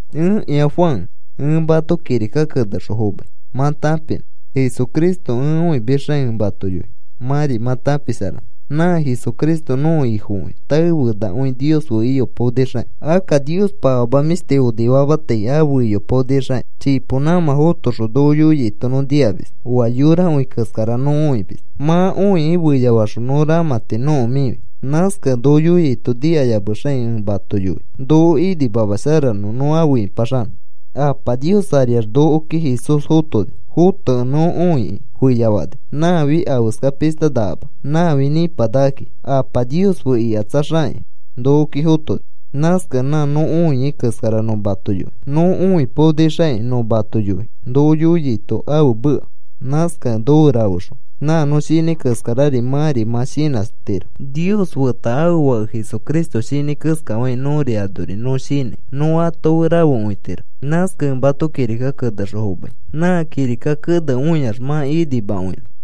Ẽkĩa Juan, ẽ mato kirika kenexõ fomai mã tãpinõ. Jesucristo ẽ õimisxaki ẽ mato yoi mãri mã tãpisharanõ. Nã Jesucristo nõko Ifokõi tae fenakõi Nios fe iyopaonixakĩ. Akka Niospa afama mĩshti onifamatai afe iyopaonixakĩ, chipo nãmã fotoxõ noko yoiaito nõ nikamis. Oa yorakõi keskara nõ õimis. Mã õikĩ feyafaxõ nõ ramãti nõko mĩfi. Nãskakẽ noko yoiaito nikayamexakĩ ẽ mato yoi, noko imasharanõ nõ afe ĩpaxanõ. Apa Nios ariax nokoki Jesús fotoni. Fotokẽ nõ õikĩ feyafani. Nãfi afeskapishta nakama, nãfi nĩpanakakĩ. Apa Nios fe ikatsaxakĩ nokoki fotoni. Nãskakẽ nã nõ õia keskara nõ mato yoi. Nõ õipaonixakĩ nõ mato yoi noko yoiaito ãfe meka. Nãskakẽ nofe rafexõ nã nõ shinãi keskarari mãri mã shinãtiro. Nios feta ãfe Fake Jesucristo shinãi keskafakĩ nõri anori nõ shinãi, nõ ato fe rafekõitiro. Nãskakẽ ẽ mato kirika kenexõ fomai nã kirika kene õiax mã inimakõinõ.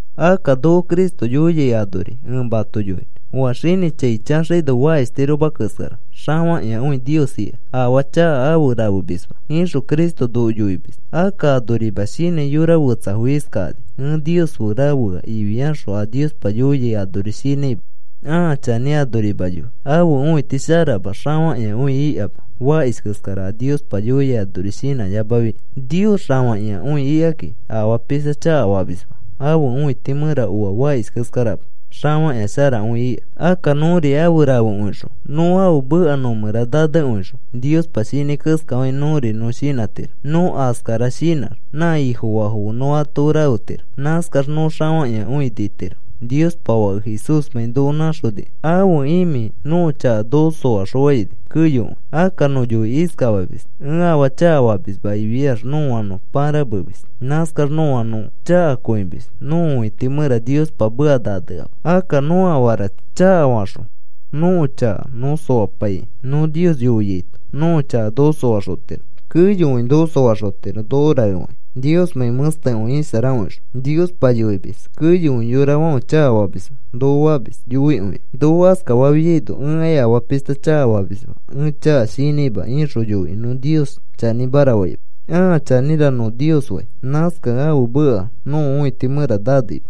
Akka noko Cristo yoiai, anori ẽ mato yoinõ. “Oa xinĩ chai chaxaino fakishtiroma keskara, xafakĩakõi Nios ika. Afaa chaka afe rafemisma,” ixõ Cristo noko yoimis. Akka anorima shinãi yora fetsafo iskakani: “Ẽ Nios fe rafea,” ifiaxõ a Niospa yoiai anori shinãima ãa chanĩ anorima yoi. Ãfe õiti sharama xafakĩakõi ikama, fakish keskara a Niospa yoiai anori shinãyamafi. Nios xafakĩakõi ikakĩ, afaa pishta chakafamisma. Ãfe õiti mẽra oa fakish keskarama, xafakĩa sharakõi ika. Akka nõri afe rafekõixõ, nõ ãfe meka nõ mẽra nanekõixõ, Niospa shinãi keskafakĩ nõri nõ shinãtiro. Nõ askara shinãx, nã Ifofaafo fe nõ ato fe rafetiro. Nãskax nõ xafakĩakõi nitiro, Niospa Fake Jesúsmãi noko nãxonikẽ. Ãfe imĩ nõko chaka noko soaxõfafãini keyokõi. Akka nõ yoikĩ iskafamis: “Ẽ afaa chakafamisma,” ifiax nõa nõ pãramemis. Nãskax nõa nõ chanĩkõimis. Nõko õiti mẽra Niospa meka naneama. Akka nõ afara chakafaxõ nõko chaka nõ soapaikĩ, nõ Nios yoiaito nõko chaka noko soaxotiro. Keyokõi noko soaxotiro noko raefakĩ, Niosmãi mẽstekõi isharakõixõ. Niospa yoimis: “Keyokõi yorafãfe chakafamisfo,” noko famis yoikõikĩ. Noko askafafiaino, “Ẽkai afaa pishta chakafamisma, ẽ chaka shinãima,” ixõ yoikĩ nõ Nios chanĩmara faima, “Ãa chanĩra,” nõ Nios fai. Nãskakẽ ãfe meka nõko õiti mẽra naneima.